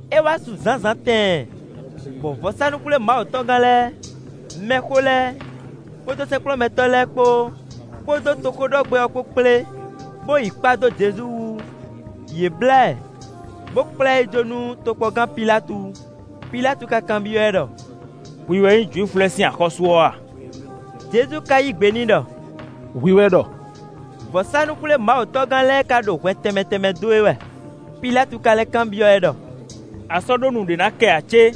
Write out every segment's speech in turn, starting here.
É wá su zǎnzǎn tɛɛn, bɔ vɔ̌sánú-xwlémawutɔ́gán lɛ́ɛ, mɛxó lɛ́ɛ, kpódó sɛ́nkplɔ́nmɛtɔ́ lɛ́ɛ kpó, kpódó toxóɖɔgbɛ́ ɔ́ kpó kplé, bó yi kpá dó Jezu wú. Yě blǎ ɛ, bo kplá ɛ yi jó nú tokpɔngán Pilátu. Pilátu ka kanbyɔ́ ɛ ɖɔ: “Hwi wɛ nyí Jwifu lɛ́ɛ sín axɔ́sú ɔ́ a?” Jezu ka yí gbe n'i ɖɔ: “Hwi wɛ ɖɔ.” Vɔ̌sánú-xwlémawutɔ́gán lɛ́ɛ ka ɖo hwɛ tɛnmɛ tɛnmɛ dó e wɛ. Pilátu ka lɛ́ kanbyɔ́ ɛ ɖɔ: “A sɔ́ ɖó nu ɖé ná kɛ ǎ cé?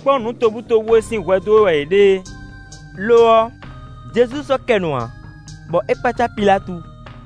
Kpɔ́n nǔ tobutóbú e sín hwɛ dó we wɛ yě ɖe é.” Lo ɔ́, Jezu sɔ́ kɛ nu ǎ, bɔ é kpácá Pilátu.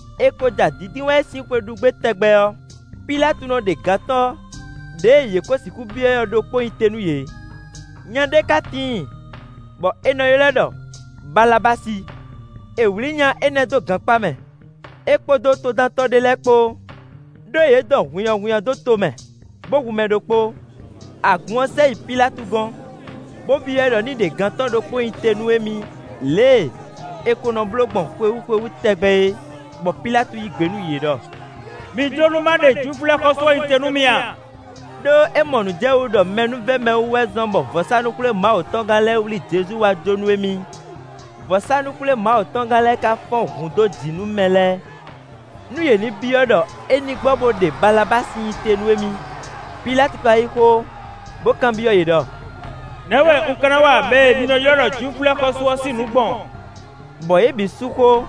È ko ja Dǐndínwáyi sín xwe ɖu gbé tɛgbɛ ɔ́, Pilátu nɔ ɖe gantɔ́ ɖěe yě kó sixú byɔ́ ɛ ɔ́ ɖokpó nyi te nú yě. Nya ɖé ka tíin, bɔ è nɔ ylɔ́ ɛ ɖɔ Balabási. È wlǐ nya énɛ́ dó gankpá mɛ, é kpódó todántɔ́ ɖé lɛ́ɛ kpó, ɖó yě dɔn hunnyahunnya dó to mɛ, bó hu mɛ ɖokpó. Agun ɔ́ sɛ yi Pilátu gɔ́n, bo byɔ́ ɛ ɖɔ ní ɖe gantɔ́ ɖokpó nyi te nú émí lě e è ko nɔ bló gbɔn xwewú xwewú tɛgbɛ é. Bɔ Pilátu yí gbe nú yě ɖɔ: “Mi jló nú má ɖe Jwifu lɛ́ɛ xɔ́sú ɔ́ nyi te nú mi a?” Đó é mɔ nǔ jɛ wú ɖɔ mɛnúvɛ́mɛwú wɛ zɔ́n bɔ vɔ̌sánú-xwlémawutɔ́gán lɛ́ɛ wlí Jezu wá jó nú émí. Vɔ̌sánú-xwlémawutɔ́gán lɛ́ɛ ka fɔ́n hun dó jǐ nú mɛ lɛ́ɛ nú yě ní byɔ́ ɖɔ é ní gbɔ bó ɖe Balabási nyi te nú émí. Pilátu ka yí xó, bó kanbyɔ́ yě ɖɔ: “Nɛ̌ wɛ un ka ná wa mɛ e mi nɔ ylɔ́ ɖɔ Jwifu lɛ́ɛ xɔ́sú ɔ́ sín nǔ gbɔn?” Bɔ yě bǐ sú xó,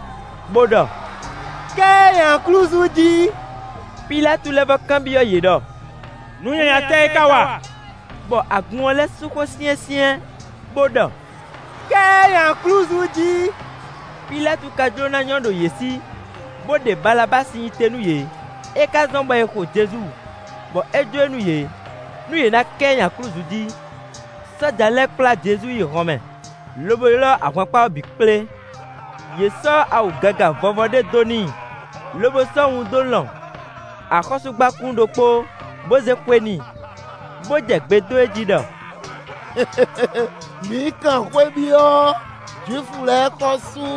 bo ɖɔ: “Ká ɛ nyi aklúzu jí.” Pilátu lɛ́ vɔ́ kanbyɔ́ yě ɖɔ: “Nǔ nyanya tɛ́ é ka wa?” Bɔ agun ɔ́ lɛ́ sú xó syɛ́nsyɛ́n, bó ɖɔ: “Ká ɛ nyi aklúzu jí.” Pilátu ka jló ná nyɔ́ ɖo yě sí, bo ɖe Balabási nyi te nú yě; é ka zɔ́n bɔ è xo Jezu, bɔ é jó e nú yě, nú yě na ká ɛ nyi aklúzu jí. Sɔ́ja lɛ́ɛ kplá Jezu yi hɔnmɛ, lobo ylɔ́ ahwankpá ɔ́ bǐ kplé. Yě sɔ́ awu gaga vɔ́vɔ́ ɖé dó n'i, lobo sɔ́ wun dó lɔn axɔ́súgbákún ɖokpó, bó zé xwe n'i. Bó jɛ gbe dó e jí ɖɔ: “Mǐ kan xwé byɔ́, Jwifu lɛ́ɛ xɔ́sú!”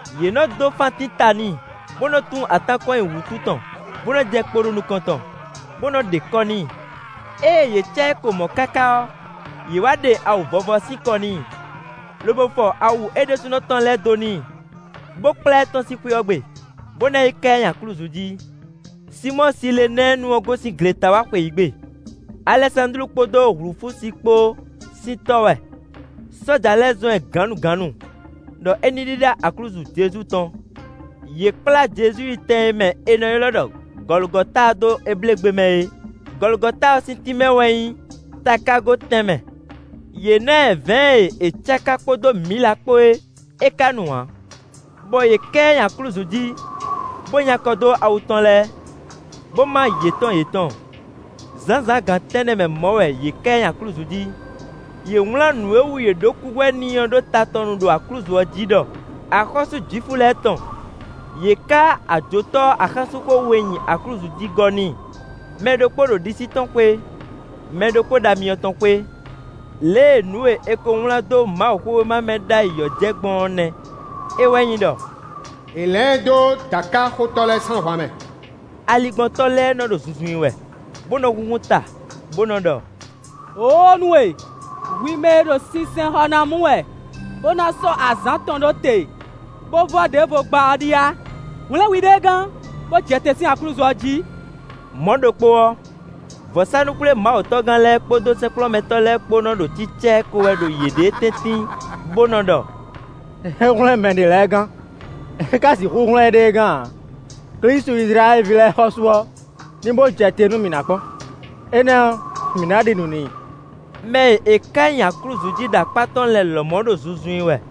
Yě nɔ dó fántín ta n'i, bó nɔ́ tún atán kɔn nyi wútu tɔn, bó nɔ́ jɛ kpo nukɔn tɔn, bó nɔ́ ɖe kɔ́ n'i. Ée yě cá ɛ ko mɔ̌ káká ɔ́, yě wǎ ɖe awu vɔ́vɔ́ ɔ́ sín kɔ n'i, lobo fɔ awu é ɖésúnɔ tɔn lɛ́ɛ dó n'i, bó kplá ɛ tɔ́n sín xwé ɔ́ gbe, bó ná yi ká ɛ nyi aklúzu jí. Sinmɔ́ɔ Silenɛ́ɛnu ɔ́ gosín gleta wá xweyǐgbe. Alɛsándlu kpódó Hlufúsi kpó sín tɔ́ wɛ. Sɔ́ja lɛ́ɛ zɔ́n ɛ gǎnnugǎnnu, ɖɔ é ní ɖíɖá aklúzu Jezu tɔn. Yě kplá Jezu yi tɛn e mɛ è nɔ ylɔ́ ɖɔ Gɔlugɔta dó Ebléegbe mɛ é. Gɔlugɔta ɔ́ sín tínmɛ wɛ nyí “takágo tɛnmɛ”. Yě ná ɛ vɛ̌ɛn e è cáká kpódó mǐla kpó é; é ka nu ǎ. Bɔ yě ká ɛ nyi aklúzu jí, bó nyi akɔ dó awu tɔn lɛ́ɛ, bó má yětɔn yětɔn. Zǎnzǎn gan tɛ́nnɛ mɛ mɔ̌ wɛ yě ká ɛ nyi aklúzu jí. Yě wlán nǔ e wú yě ɖó kúhwɛ n'i ɔ́ ɖó ta tɔn nu ɖo aklúzu ɔ́ jí ɖɔ: “Axɔ́sú Jwifu lɛ́ɛ tɔn.” Yě ká ajotɔ́ axánsúnxó we nyi aklúzu jí gɔ́ n'i: mɛ ɖokpó ɖo ɖisí tɔn xwé, mɛ ɖokpó ɖo amyɔ tɔn xwé. [ Lě e nǔ e è ko wlán dó Mawuxówéma mɛ ɖ'ayǐ ɔ́ jɛ gbɔn ɔ́ nɛ́; é wɛ nyí ɖɔ: “È lɛ̌n ɛ dó dǎkaxotɔ́ lɛ́ɛ sín ahwan mɛ.”] Aligbɔntɔ́ lɛ́ɛ nɔ́ ɖo zunzun i wɛ, bó nɔ́ húnhún ta, bó nɔ́ ɖɔ: “Wǒóo nú we! Hwi mɛ e ɖo sinsɛnxɔ ná mu wɛ, bó ná sɔ́ azǎn atɔn ɖó te, bó vɔ́ ɖěvo gbá ɔ́ ɖíe a? Hwlɛ̌n hwiɖée gán, bó jɛ te sín aklúzu ɔ́ jí.” Mɔ̌ ɖokpó ɔ́, vɔ̌sánú-xwlémawutɔ́gán lɛ́ɛ kpódó sɛ́nkplɔ́nmɛtɔ́ lɛ́ɛ kpó nɔ́ ɖo cícá ɛ ko wɛ ɖo yěɖée tɛ́ntin, bó nɔ́ ɖɔ: “É hwlɛ́n mɛ ɖě lɛ́ɛ gán; é ka sixú hwlɛ́n éɖée gán ǎ! Klísu Izlayɛ́li ví lɛ́ɛ xɔ́sú ɔ́ ní bó jɛ te nú mǐ nǎ kpɔ́n; énɛ́ ɔ́, mǐ ná ɖi nǔ n'i.” Mɛ e è ká nyi aklúzu jí ɖo akpá tɔn lɛ́ɛ lɔmɔ̌ ɖo zunzun i wɛ.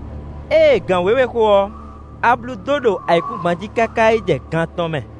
Ée gan wěwe xo ɔ́, ablu dó ɖo ayǐkúngban jí káká yi jɛ gan atɔn mɛ.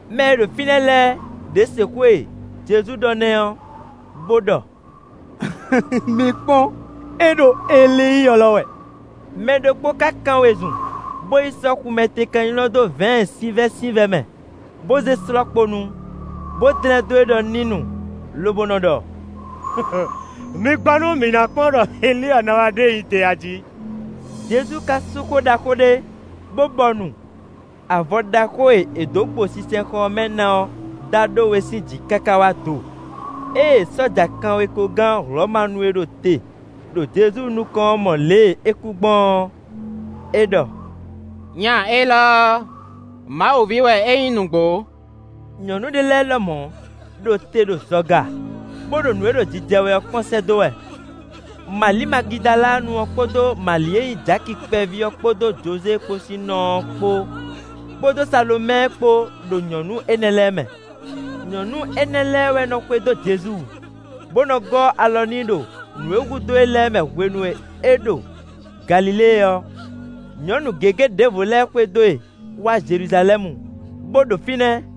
Mɛ e ɖo fínɛ́ lɛ́ɛ ɖě se xó e Jezu ɖɔ nɛ́ ɔ́, bó ɖɔ: “Mi kpɔ́n! É ɖo Elíi ylɔ́ wɛ.” Mɛ ɖokpó ka kán wezun, bó yi sɔ́ xumɛtekan nylɔ́ dó vɛ̌ɛn sinvɛ́sinvɛ́ mɛ, bó zé slɔ́ kpo nu, bó dlɛ́n dó e ɖɔ ní nu, lobo nɔ́ ɖɔ: “Mi gbɔ nú mǐ ná kpɔ́n ɖɔ Elíi ɔ́ ná wá ɖe e jɛ te a jí.” Jezu ka sú xó ɖaxó ɖé, bó bɔnu. Avɔ ɖaxó e è dó gbo sinsɛnxɔ ɔ́ mɛ ná ɔ́ dá ɖó we sín jǐ káká wá do. Ée sɔ́ja kanwekogán Hlɔ̌manu e ɖo te ɖo Jezu nukɔn ɔ́ mɔ lě e é kú gbɔn ɔ́, é ɖɔ: “Nya élɔ́ ɔ́, Mawu ví wɛ é nyí nǔgbó.” Nyɔ̌nu ɖé lɛ́ɛ lɔmɔ̌ ɖo te ɖo zɔga, bó ɖo nǔ e ɖo jijɛ wɛ ɔ́ kpɔ́n sɛ́ dó wɛ. Mali Magidalanu ɔ́ kpódó Mali e nyí Jaki kpɛví ɔ́ kpódó Jozée kpó sín nɔ ɔ́ kpó, kpódó Salomɛ́ɛ kpó ɖo nyɔ̌nu énɛ́ lɛ́ɛ mɛ. Nyɔ̌nu énɛ́ lɛ́ɛ wɛ nɔ́ xwedó Jezu, bó nɔ́ gɔ́ alɔ n'i ɖo nǔ e hudó e lɛ́ɛ mɛ hwenu e é ɖo Galilée ɔ́. Nyɔ̌nu gěgé ɖěvo lɛ́ɛ xwedó e wá Jeluzalɛ́mu, bó ɖo fínɛ́.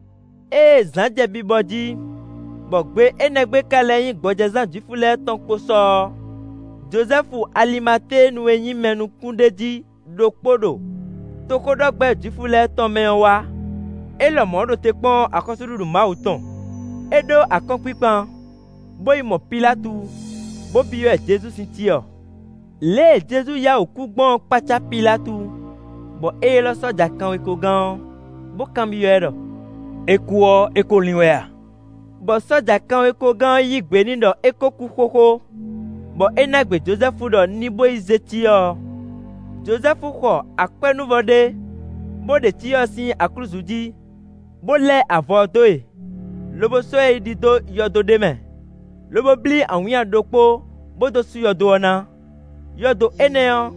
Ée zǎn jɛ bibɔ jí, bɔ gbe énɛ́ gbe ká lɛ́ nyí gbɔjɛzán Jwifu lɛ́ɛ tɔn kpo sɔ ɔ́, Jozɛ́fu Alimatéenu e nyí mɛ nukúnɖéjí ɖokpó ɖo toxóɖɔgbɛ́ Jwifu lɛ́ɛ tɔn mɛ ɔ́ wá; é lɔmɔ̌ ɖo te kpɔ́n axɔ́súɖuɖu Mawu tɔn. É ɖó akɔ́nkpinkpan, bó yi mɔ Pilátu, bó byɔ́ ɛ Jezu sín cyɔ. Lě e Jezu yá wǔ kú gbɔn ɔ́ kpácá Pilátu, bɔ é ylɔ́ sɔ́ja kanwekogán ɔ́, bó kanbyɔ́ ɛ ɖɔ: “É kú ɔ́, é kó lín wɛ a?” Bɔ sɔ́ja kanwekogán ɔ́ yí gbe n'i ɖɔ é kó kú xóxó, bɔ é ná gbe Jozɛ́fu ɖɔ ní bó yi zé cyɔ ɔ́. Jozɛ́fu xɔ akwɛ́núvɔ ɖé, bó ɖe cyɔ ɔ́ sín aklúzu jí, bó lɛ́ avɔ ɔ́ dó e, lobo sɔ́ ɛ yi ɖi dó yɔdo ɖé mɛ, lobo blí awǐnnya ɖokpó bó dó sú yɔdo ɔ́ ná. Yɔdo énɛ́ ɔ́,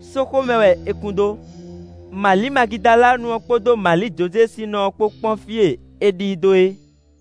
sóxo mɛ wɛ è kun dó. Mali Magidalanu ɔ́ kpódó Mali Jozée sín nɔ kpó kpɔ́n fí e è ɖi i dó é.